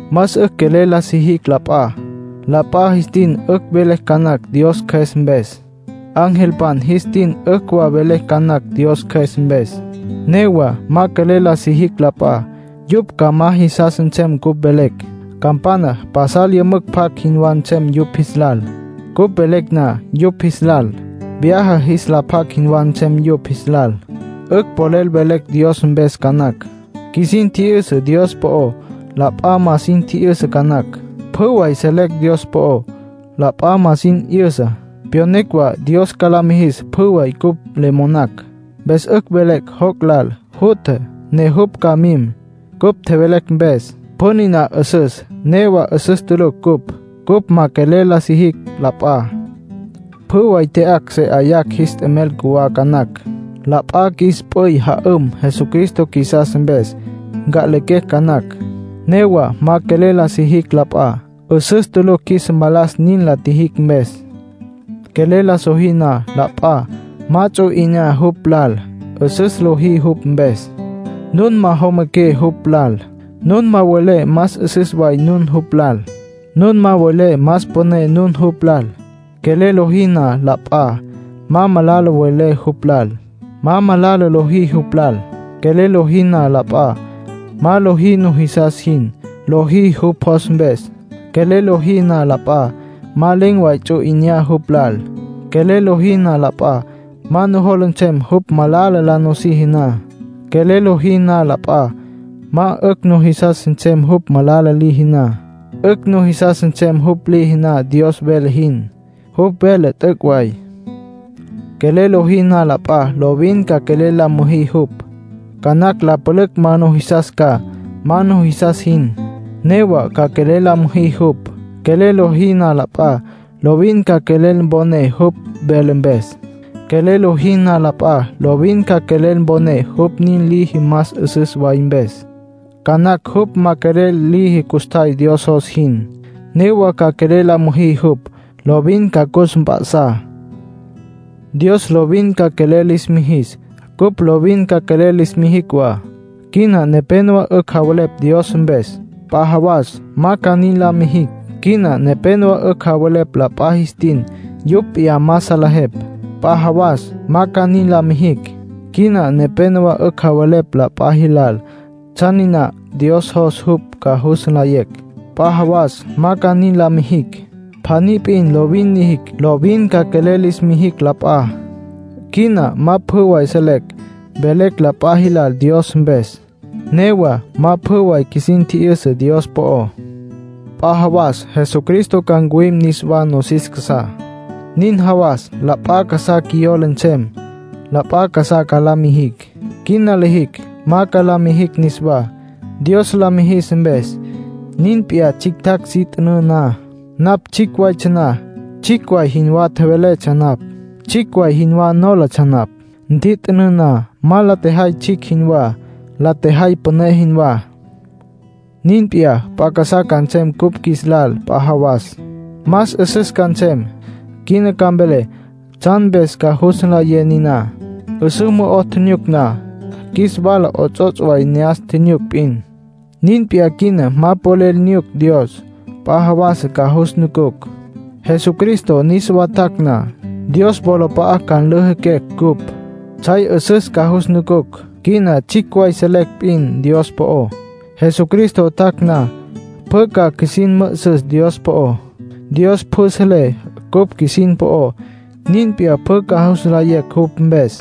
Más 'ücj quelel la sijicj la p'a. La p'a jis tin 'ücj velecj ca nacj Dios Cjües mpes. Angelpan jis tin 'ücj wa velecj ca nacj Dios Cjües mpes. Newa ma quelel la sijicj la p'a, yupj ca ma jisas nsem cupj velecj. Campana pasal yümücj pjac jinwá nsem yupj jis lal, cupj velecj na yupj jis lal. Vyaja jis la pjac jinwá nsem yupj jis lal. 'Ücj polel velecj Dios mpes ca nacj. Qjuisin tji'yüsa Dios po'ó, la p'a ma sin tji'yüsa ca nacj. Pjü way selecj Dios po'ó, la p'a ma sin 'yüsá. Pyonecj wa Dios ca la mijis pjü way cupj le monacj. Mpes 'ücj velecj joc' lal jutja, ne jupj ca mim, cupj tjevelecj mpes. Pjü niná 'üsüs; newa 'üsüs tulucj cupj, cupj ma quelel la sijicj la p'a. Pjü way tya'acj se 'ayacj jis t'emel cjuwá ca nacj. La p'a qjuis p'üy ja'üm Jesucristo qjuisas mpes, nca'lequecj ca nacj. Newa ma quelel la sijicj la p'a, 'üsüs tulucj qjuis mpalas nin la tjijicj mpes. Quelel la sojí na la p'a, ma ts'u 'inyá jupj lal. 'Üsüs lojí jupj mpes. Nun ma jomaqué jupj lal. Nun ma welé más 'üsüs way nun jupj lal. Nun ma welé más püné nun jupj lal. Quelel lojí na la p'a, ma malala welé jupj lal, ma malala lojí jupj lal. Quelel lojí na la p'a, ma lojí nujisas jin. Lojí jupj jos mpes. Quelel lojí na la p'a, ma len̈ way ts'u 'inyá jupj lal. Quelel lojí na la p'a, ma nujola nsem jupj malala la nusiji na. Quelel lojí na la p'a, ma 'ücj nujisas nsem jupj malala liji na. 'Ücj nujisas nsem jupj liji na Dios vele jin. Jupj vele t'üc' way. Quelel lojí na la p'a, lovin ca quelel la müjí jupj. Ca nacj la pülücj la numijis ca, ma nujisas jin. Newa ca quelel la müjí jupj. Quelel lojí na la p'a, lovin ca quelel mponé jupj vele mpes. Quelel lojí na la p'a, lovin ca quelel mponé jupj nin liji más 'üsüs way mpes. Ca nacj jupj ma quelel liji custjay Dios jos jin; newa ca quelel la müjí jupj, lovin ca cus mp'a'sá. Dios lovin ca quelel lis mijis, cupj lovin ca quelel lis mijicj wa. Quina nepénowa 'ücj javelepj Dios mpes. P'a jawas ma ca nin la mijicj. Quina nepénowa 'ücj javelepj la p'a jis tin yupj p'iyá ma salejepj. P'a jawas ma ca nin la mijicj. Quina nepénowa 'ücj javelepj la p'a jilal tsjan niná Dios jos yupj ca jus nlayecj. P'a jawas ma ca nin la mijicj. Pjaní p'in lovin lijicj: lovin ca quelel lis mijicj la p'a. Quina ma pjü way selecj. Velecj la p'a jilal Dios mpes. Newa ma pjü way qjuisin 'yüsa Dios po'ó. P'a jawas Jesucristo ca ncuwim niswá nosis casá. Nin jawas la p'a casá qjuiyola nsem, la p'a casá ca la mijicj. Quina lijicj, ma ca la mijicj niswá, Dios la mijis mpes. Nin p'iyá tsjictjacj si t'ünǘ na. Napj tsjicj waytsja na, tsjicj way jinwá tjeveletsja napj. Tsjicj way jinwá nólatsja napj. Ntjit'ünǘ na, ma la tjejay tsjicj jinwá. La tjejay püné jinwá. Nin p'iyá, p'a casá ca nsem cupj qjuis lal p'a jawas; más 'üsüs ca nsem. Quina ca mvelé tsjan mpes ca jus nlayé niná. 'Üsǘ mo'o nyucucj na, qjuis wala 'ots'ots' way ne'as nyucucj p'in. Nin p'iyá quina ma polel nyucucj Dios. P'a jawas ca jus nucucj. Jesucristo niswa tjac' na, Dios wolap'a'a ca nlüjüquecj cupj. Tsjay 'üsüs ca jus nucucj. Quina tsjicj way selecj p'in Dios po'ó. Jesucristo tjac' na, pjü ca qjuisin mü'üsüs Dios po'ó. Dios pjü selé cupj qjuisin po'ó. Nin p'iyá pjü ca jus nlayecj jupj mpes.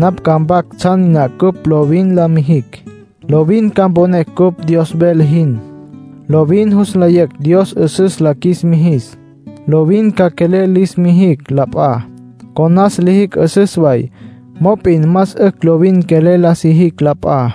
Napj ca mpac tsjan niná cupj lovin la mijicj. Lovin ca mponecj cupj Dios vele jin. Lovin jus nlayecj Dios 'üsüs la qjuis mijis. Lovin ca quelel lis mijicj la p'a. Conas lijicj 'üsüs way. Mop'in más 'ücj lovin quelel la sijicj la p'a.